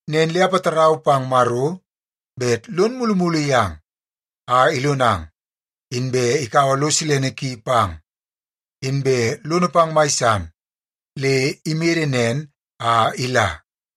Nen le apatarau pang Maro bet lon mulumulu yang a ilonang, inbe ikaua lo silene ki pang, inbe lono pang mai san le imede nen a ila.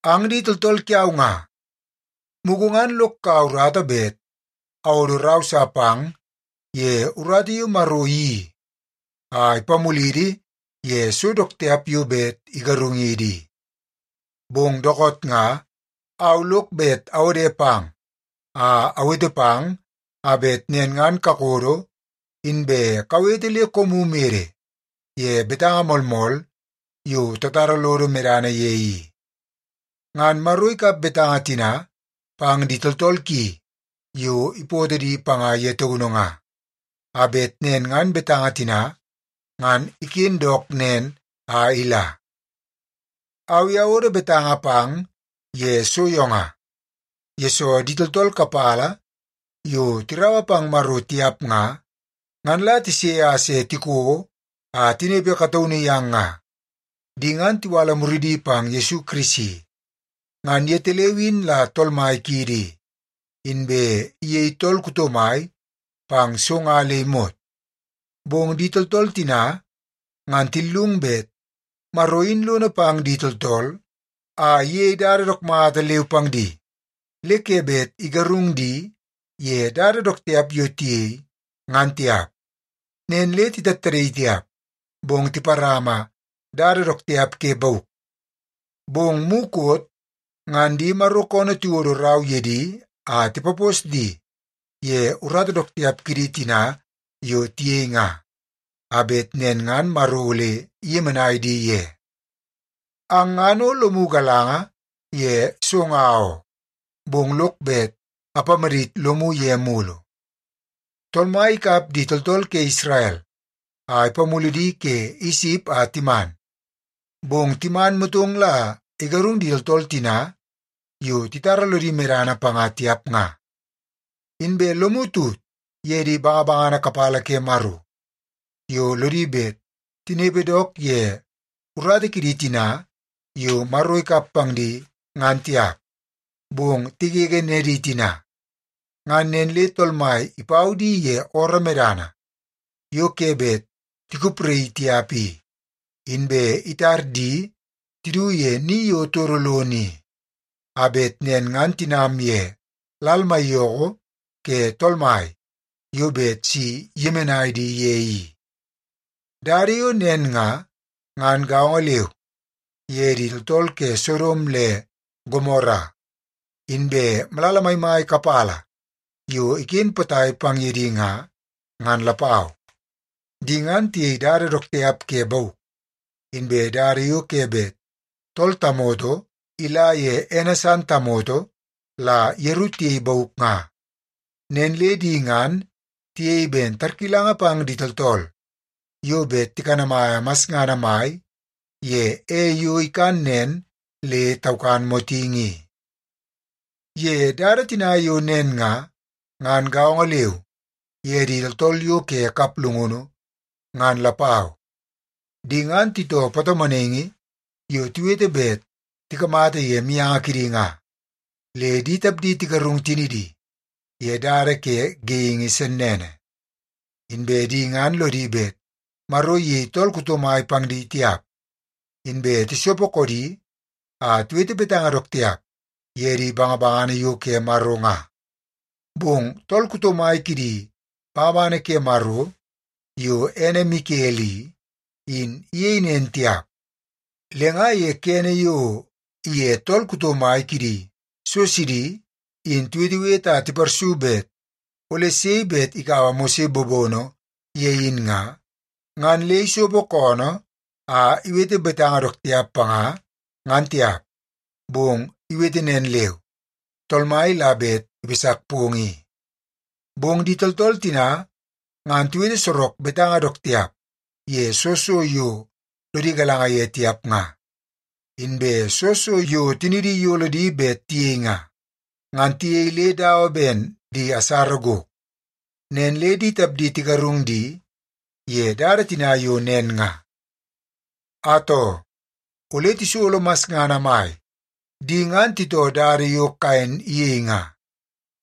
Ang di tooltool kiau nga, mugu ngan lok kaua urata bet awodo rau sa pang ye urata yo Maro iyeii a ipamulidi ye so dook tiap yo bet igarungidi i. Bong dookoot nga, au lok bet awode pang a awete pang a bet nen ngan kakodo inbe kawete le koomu mede ye betanga moolmool yo tatara lodo medana ye i. Ngan Maro ikap betanga tina pang di tooltool ki yo ipootoo di panga ye taunu nga, a bet nen ngan betanga tina ngan iken dook nen a ila. Au i awodo betanga pang ye so yo nga, yesoo di tooltool kapala yo tiraua pang Maro tiap nga, ngan la tise a se tiko a tinepe kataunu yang nga. Di ngan tiwala muridi pang Yesu Kirisi. Ngan yetaleu in la Tool Mai kiidi i, inbe iyei tool kuto mai pang so nga le imot. Bong di tooltool tina ngan tillung bet Maro in lono pang di tooltool a iyei dada dook mata leu pang di, le ke bet igarung di ye dada dook tiap yo tiyei, ngan tiap. Nen le titattadaii tiap, bong tiparama dada dook tiap ke bauk. Bong mukot ngan di Maro koonoo tiwodo rau ye di a tipapos di ye urata dook tiap kidi tina yo tiyei nga, a bet nen ngan Maro ole iyemenai di ye. Ang ngan o lomu galanga ye so nga oo, bong lok bet apamadit lomu ye mulu. Tool Mai ikap di tooltool ke Isrel a ipamulu di ke Isip a timan, bong timan motong la igarung di tooltool tina yo titara lodi medana panga tiap nga. Inbe lomu tut ye di bangabangana kapala ke Maro yo lodi bet tinepe dook ye urata kidi tina yo Maro ikap pang di ngan tiap, bong tigege nedi tina. Ngan nen le Tool Mai ipau di ye ooroo medana yo ke bet tikupraii tiap i, inbe itar di tidu ye ni yo todo lono i, a bet nen ngan tinam ye Lal Maiyoko ke Tool Mai yo bet si iyemenai di ye i. Dada yo nen nga, ngan gaongo leu ye di tooltool ke Sodom le Gomora inbe malala maimai kapala yo iken potai pang ye di nga, ngan lapau. Di ngan tiyei dada dook tiap ke bauk, inbe dada yo ke bet tool tamoto ila ye ene san tamoto la yeru tiyei bauk nga. Nen le di ngan tiyei ben tarkilanga pang di tooltool yo bet tikanamaia masngana mai ye ei yo ikan nen le taukan motingi i. Ye dada tina yo nen nga, ngan gaongo leu ye di tooltool yo ke kaplungunu ngan lapau. Di ngan titoo patomonaingi yo tiwete bet tikamata ye mianga kidi nga, le di tapdi tigarung tinidi ye dada ke geingi sennene. Inbe di ngan lodi bet Maro iyei tool kuto mai pang di tiap, inbe tisopo koodi a tiwete betanga dook tiap ye di bangabangana yo ke Maro nga. Bong tool kuto mai kidi bangabangana ke Maro yo ene Mikel i, in iyei nen tiap. Le nga ye kene yo iye tool kuto mai kidi so sidi in tiwetewete a tiparsu bet ole sei bet ikaua Mose bobono ye in nga, ngan le isopo koonoo a iwete betanga dook tiap panga, ngan tiap. Bong iwete nen leu, “Tool Mai la bet ipasak pong i.” Bong di tooltool tina ngan tiwete sorok betanga dook tiap ye soo so yo lodi galanga ye tiap nga. Inbe soo so yo tinidi iyolo di bet tiyei nga, ngan tiyei le dawa ben di asara gok. Nen le di tapdi tigarung di ye dada tina yo nen nga. Atoo, ole tisolo masngana mai! Di ngan titoo dada yo Kaen iyei nga.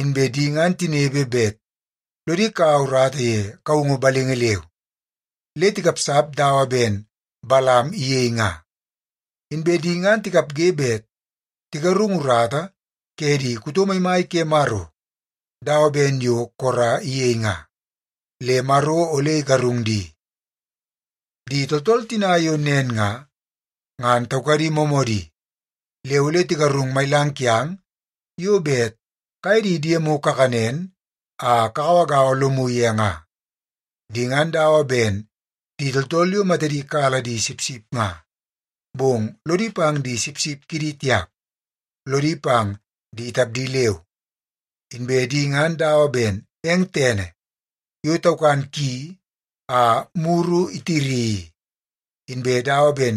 Inbe di ngan tinepe bet lodi kaua urata ye kaungu balingi leu, le tikapsap dawa ben Balam iyei nga. Inbe di ngan tikapge bet tigarung urata ke di kuto maimai ke Maro dawa ben yo Kora iyei nga, le Maro ole igarung di. Di tooltool tina yo nen nga, ngan taukadi moomoodi le ole tigarung mailang kiang yo bet kaye di diemu kakanen a kagauagaua lomu ye nga. Di ngan dawa ben di tooltool yo matadi kala di sipsip nga. Bong lodi pang di sipsip kidi tiap, lodi pang di tapdi leu. Inbe di ngan dawa ben eng tene yo taukan ki a muru itiri i, inbe dawa ben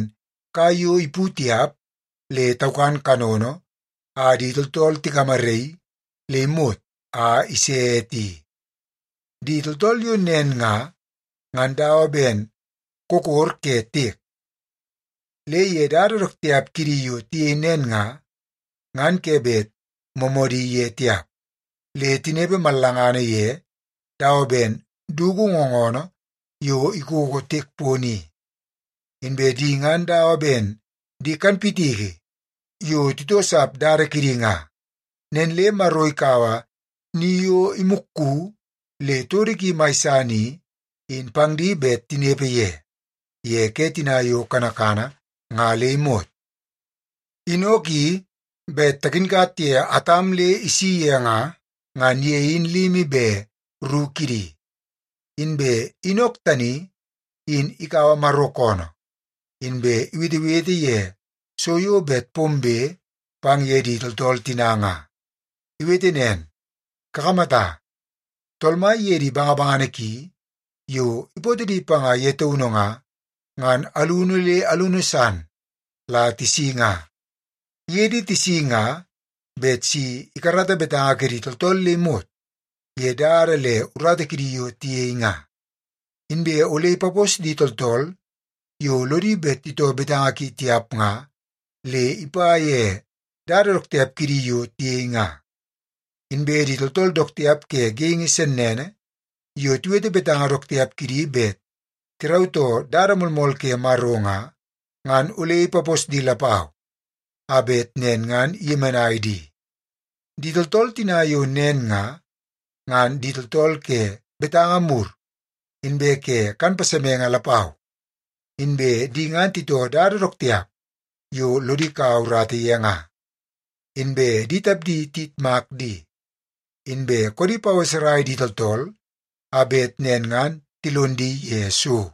kai yo ipu tiap le taukan kanono a di tooltool tigamaraii le imot a ise ete i. Di tooltool yo nen nga, ngan dawa ben kokor ke tiek. Le ye dada dook tiap kidi yo tiyei nen nga, ngan ke bet moomoodi ye tiap, le tinepe mallangana ye dawa ben dugu ngoonoo yo ikoko tiek pono i. Inbe di ngan dawa ben di kanpitiki yo titoosap dada kidi nga. Nen le Maro ikaua ni yo imukku le todo ki mai san i, in pang di bet tinepe ye, ye ke tina yo kanakana nga le imot. Inok i, bet takinkat ye Atam le isi ye nga, ngan ye in limi be ru kidi. Inbe Inok tani in ikaua Maro koonoo inbe iwetewete ye so yo bet pombe pang ye di tooltool tina nga. Iwete nen, “Kakamata, Tool Mai iye di bangabangana ki yo ipootoo di panga ye taunu nga, ngan alunu le alunu san la tisi nga. Iye di tisi nga bet si ikarata betanga kidi tooltool le imot ye dada le urata kidi yo tiyei nga. Inbe ole ipapos di tooltool yo lodi bet titoo betanga ki tiap nga le ipa ye dada dook tiap kidi yo tiyei nga. Inbe di tooltool dook tiap ke geingi sennene yo tiwete betanga dook tiap kidi bet tirautoo dada moolmool ke Maro nga, ngan ole ipapos di lapau a bet nen ngan iyemenai di.” Di tooltool tina yo nen nga, ngan di tooltool ke betanga mur inbe ke kan pasemenge lapau. Inbe di ngan titoo dada dook tiap yo lodi ikau urata ye nga. Inbe di tapdi tiyitmak di, inbe koodi paweserai di tooltool a bet nen ngan tilon di ye so.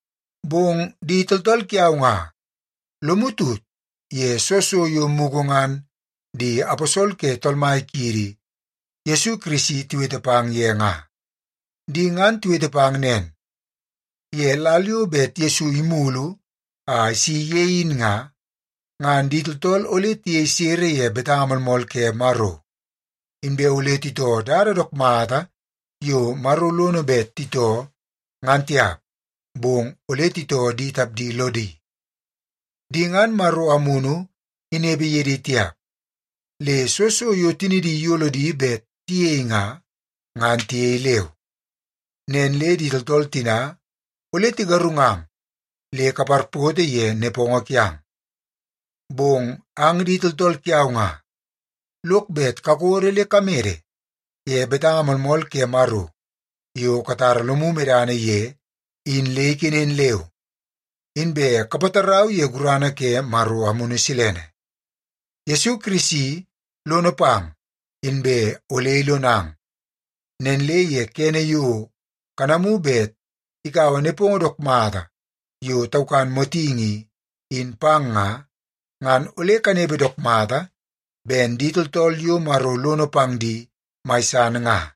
Bong di tooltool kiau nga, lomu tut ye soo so yo mugu ngan di aposol ke Tool Mai kiidi Yesu Kirisi tiwete pang ye nga. Di ngan tiwete pang nen, “Ye lal yo bet Yesu imulu a isi ye in nga, ngan di tooltool ole tiyei sere ye betanga moolmool ke Maro, inbe ole titoo dada dook mata yo Maro lono bet titoo, ngan tiap, bong ole titoo di tapdi lodi.” Di ngan Maro Amunu inepe ye di tiap, le soo so yo tinidi iyolo di bet tiyei nga, ngan tiyei leu. Nen le di tooltool tina ole tigarungang le kaparpoto ye nepongo kiang. Bong ang di tooltool kiau nga, lok bet kakodo le kamede ye betanga moolmool ke Maro yo katara lomu medana ye in le ikenen leu, inbe kapatarau ye gurana ke Maro Amunu Silene. Yesu Kirisi lono pang inbe ole ilonang. Nen le ye kene yo kanamu bet ikaua nepongo dook mata yo taukan motingi i, in pang nga, ngan ole kanepe dook mata ben di tooltool yo Maro lono pang di mai san nga.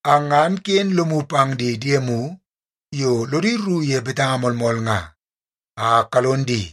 Ang ngan ken lomu pang di diemu yo lodi rru ye betanga moolmool nga, a kalon di.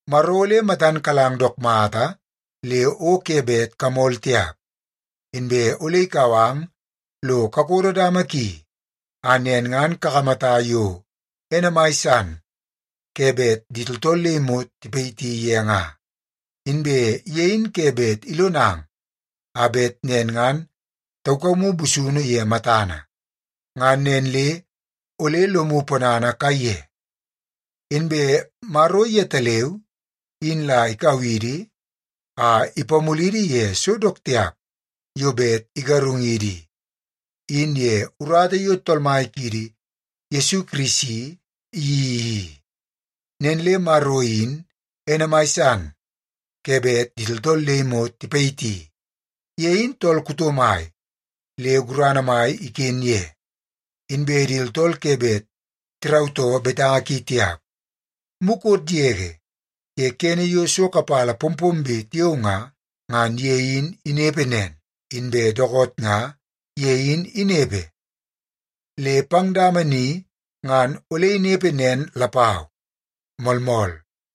Maro ole matan kalang dook mata le o ke bet kamol tiap. Inbe ole ikau ang lo kakodo dama ki a nen ngan kakamata yo ene mai san ke bet di tooltool le imot tipayiti ye nga. Inbe ye in ke bet ilonang a bet nen ngan taukamu busunu ye matana. Ngan nen le ole lomu ponana kaiye. Inbe Maro yetaleu in la ikau idi a ipamulidi ye so dook tiap yo bet igarungidi i, in ye urata yo Tool Mai kiidi Yesu Kirisi iyeii i. Nen le Maro in ene mai san ke bet di tooltool le imot tipayiti. Ye in tool kuto mai le gurana mai iken ye, inbe di tooltool ke bet tirautoo betanga ki tiap. Mukot yege ye kene yo so kapala pompombe tiao nga, ngan ye in inepe nen. Inbe dookoot nga ye in inepe, le pang dama ni ngan ole inepe nen lapau. Moolmool.